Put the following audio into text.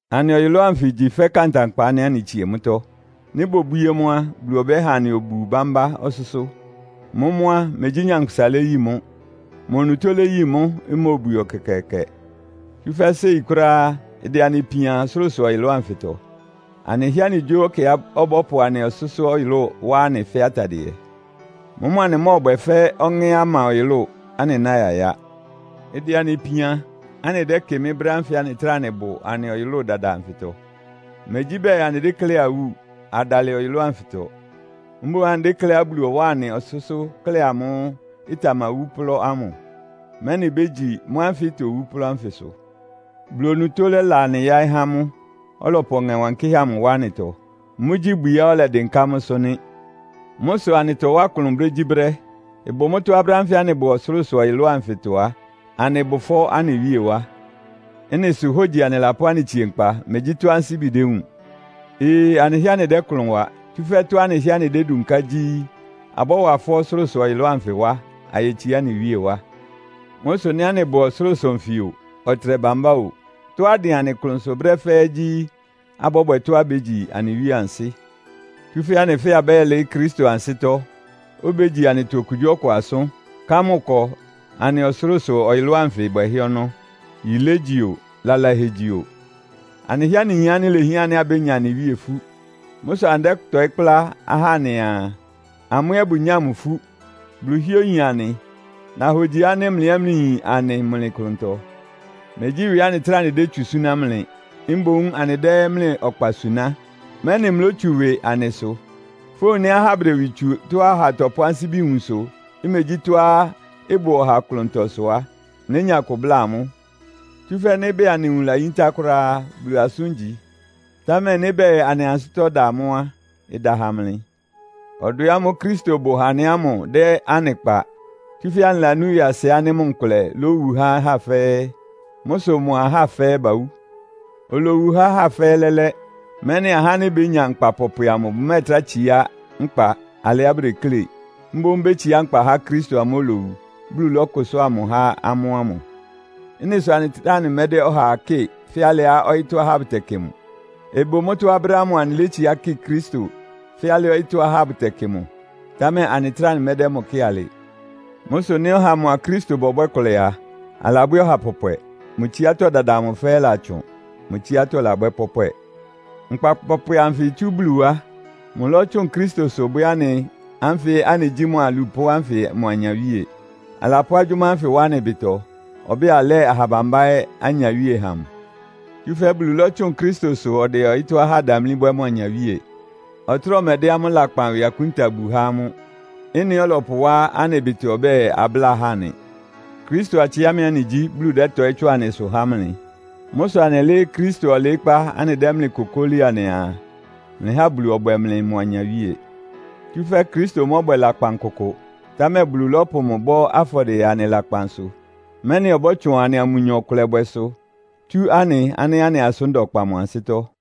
Anɩ ɔyʋlʋ́ʋ anfɩ igyi fɛ́ kantankpa ánɩ́ anɩtsie mʋ́tɔ́. Nɩ́ bobwíé mʋ́ á, Bulu ɔbɛ́ha anɩ obu bámbá ɔsʋ́sʋ́. Mʋ́mʋ́ á, megyí nyankpʋsa léyi mʋ́. Mʋ onutó léyi mʋ́, imóobwie ɛkɛkɛɛkɛ. Tsúfɛ́ séi kʋ́ráá ɩdɛ anɩ ipian ɔsʋlʋ́sʋ-ɔyʋlʋ́ʋ anfɩtɔ. Anɩhɩ́ɛ́ anɩgyó ɛkɛá ɔbɔ́pʋ anɩ ɔsʋ́sʋ́-ɔyʋlʋ́ʋ wá anɩ fɛ́ atadɩɛ. Mʋ́mʋ́ anɩmɔ́ɔbwɛ fɛ́ ɔŋɛ́á ɩma ɔyʋlʋ́ʋ, anɩná yayá. Ɩdɛ anɩ ipian, anɩdɛ́kɩmɩ́ brɛ́ ánfɩ anɩtráa anɩbʋ anɩ ɔyʋlʋ́ʋ dada anfɩtɔ. Megyí bɛɛ anɩdékléá awú, adalɩ ɔyʋlʋ́ʋ anfɩtɔ. Mboún anɩdékléá Bulu ɔwáa anɩ ɔsʋ́sʋ́ klɛ́ amʋ́ʋ́ ɩtamawú plɔ́ ámʋ, mɛ́nɩ ibégyi mʋ́ ánfɩ itowú plɔ́ ánfɩsʋ. Bulu onutó lɛ́la anɩ yáɩ́ há mʋ́, ɔlɔpʋ Ɔŋɛ Wankɩ́hɛ́ amʋ wá anɩtɔ. Mʋ́gyí ibwiá ɔlɛdɩnká mʋ́sʋ́ nɩ́. Mʋ́ sʋ anɩtɔwá klʋn brégyíbrɛ́. Ɩbʋ mʋ́tɔ́á brɛ́ ánfɩ anɩbʋ ɔsʋlʋ́sʋ-ɔyʋlʋ́ʋ anfɩtɔ á, anɩbʋ ɩfɔ́ anɩ Wíe wá. Ɩ́nɩ sʋ hógyi anɩlapʋ́ anɩtsie nkpa, megyí tɔ́á ansíbi dewúun. Ee! Anɩhɩ́ɛ́ anɩdɛ́ klʋn wa, tsúfɛ́ tɔ́á anɩhɩ́ɛ́ anɩdédunká gyí abɔ́wa ɩfɔ́ ɔsʋlʋ́sʋ-ɔyʋlʋ́ʋ anfɩ wá, ayetsiá anɩ Wíe wá. Mʋ́ sʋ nɩ́ anɩbʋ ɔsʋlʋ́sʋ nfɩ o, ɔtɩnɛ bambá o, tɔ́á ɩdɩn anɩ klʋnsʋ brɛ́ fɛ́ɛ́ gyí, abɔ́bwɛ tɔ́á ibégyi anɩ Wíe ansɩ́. Tsúfɛ́ anɩ fɛ́ɛ́ abɛ́yɛ́lɩɩ́ Kristo ansɩ́tɔ́, obégyi anɩtɔ okugyíɔkʋ asʋ́n, ká mʋ ɩkɔ anɩ ɔsʋlʋ́sʋ-ɔyʋlʋ́ʋ anfɩ bwɛhɛ́ ɔnɔ́. Yilé igyi o, lalahɛ igyi o. Anɩhɩ́ɛ́ anɩyin ánɩ́ ilehián ánɩ́ abénya anɩ Wíe ifú. Mʋ́ sʋ anɩdɛ́tɔɩ́ kplá ahá anɩaa, amʋ́ ɛ́ bʋnyáa mʋ ifú. Bulu hɩ́ɛ́ oyin anɩ. Nahogyi ánɩ́ mlɩ ɛ́ mlɩyin anɩ mlɩ klʋntɔ. Megyí ɩwɩ anɩtráa anɩdétsu súná mlɩ. Mboún anɩdɛ́ mlɩ ɔkpa suná, mɛ́nɩ mlótsu ɩwɩ anɩ sʋ. Fówun nɩ́ ahá bʋdɛ ɩwɩ tsu tɔ́á ɔha tɔpʋ́ ansíbi wun sʋ, imegyí tɔ́á ɩbʋ ɔha klʋntɔ sʋ á, mlénya kʋ bláa amʋ́. Tsúfɛ́ nɩ́ bɛɛ anɩ nwun layíntá kʋ́ráá á, Bulu asʋ́n igyi. Támɛ nɩ́ bɛɛ anɩ ansɩ́tɔ́ da mʋ́ á, ɩda ha mlɩ. Ɔdwɛ ámʋ́ʋ́ Kristo bʋ ha anɩ ámʋ dɛ́ anɩ kpa, tsúfɛ́ anɩlanú ɩwɩasɩ ánɩ́ mʋ nkʋlɛ lówu há ahá fɛ́ɛ́. Mʋ́ sʋ mʋa ahá fɛ́ɛ́ bawú. Olowu há ahá fɛ́ɛ́ lɛ́lɛ́, mɛ́nɩ ahá ánɩ́ bénya nkpa pɔpwɛ amʋ bʋmɛ́ɛtrá tsiá nkpa alɩá bʋdeklé. Mboún bétsiá nkpa há Kristo amʋ́ʋ́ olowu, Bulu lɔ́kʋsʋ́a mʋ há amʋ́ ámʋ. Ɩ́nɩ sʋ anɩtráa anɩmɛ́dɛ́ ɔhaa kɩ́ɩ fɛ́ alɩá ɔyɩ́tɔ́ ahá bʋtɛkɩ mʋ. Ɩbʋ mʋ́tɔ́á brɛ́ ámʋ anɩlétsiá kɩ Kristo fɛ́ alɩá ɔyɩ́tɔ́ ahá bʋtɛkɩ mʋ, támɛ anɩtráa anɩmɛ́dɛ́ mʋ kɩ́ɩ alɩ. Mʋ́ sʋ nɩ́ ɔha mʋa Kristo bɔbwɛ́ ɩkʋlɛ a, alabwɛ́ ɔha pɔpwɛ. Mʋ tsiátɔ́ dada amʋ fɛ́ɛ́ ɩlatsʋn. Mʋ tsiátɔ́ labwɛ́ pɔ́pwɛ! Nkpa pɔpwɛ anfɩ itsú Bulu wá. Mʋlɔ́tsʋn Kristosʋ bwɛ́ anɩ ánfɩ anɩgyí mʋ alupʋ́ ánfɩ mʋ anyawíe. Alapʋ́ agyʋ́má ánfɩ wá anɩ ɩbɩtɔ, ɔbɛ́ɛ alɛ́ɛ aha bambá ɛ́ anyawíe ha mʋ. Tsúfɛ́ Bulu lɔ́tsʋn Kristosʋ ɔdɛ ɔyɩ́tɔ́ ahá damlí bwɛ́ mʋ anyawíe. Ɔtráa ɔmɛdɛ́ amʋ́ lakpan ɩwɩ akúnta bu há amʋ́. Ɩ́nɩ ɔlɔpʋwá anɩ ɩbɩtɔ ɔbɛ́ɛ, abláa ahá nɩ. Kristo atsɩámɩ anɩgyí, Bulu dɛ́tɔɩ́ tsʋn anɩsʋ há mlɩ. Mʋ́ sʋ anɩlɩ́ɩ́ Kristo ɔlɩɩ́kpá anɩdɛ́ mlɩ kokóli anɩaa, “Mlɩha Bulu ɔbwɛ mlɩ mʋ anyawíe!” Tsúfɛ́ Kristo mɔ́bwɛ lakpan kʋkʋ! Támɛ Bulu lɔ́pʋ mʋ bɔ́ afɔdɩɛ anɩ lakpan sʋ, mɛ́nɩ ɔbɔ́tsʋn anɩa mʋnyɔ ɩkʋlɛbwɛsʋ tsú anɩ ánɩ́ anɩ asʋ́n da ɔkpa mʋ ansɩ́tɔ́.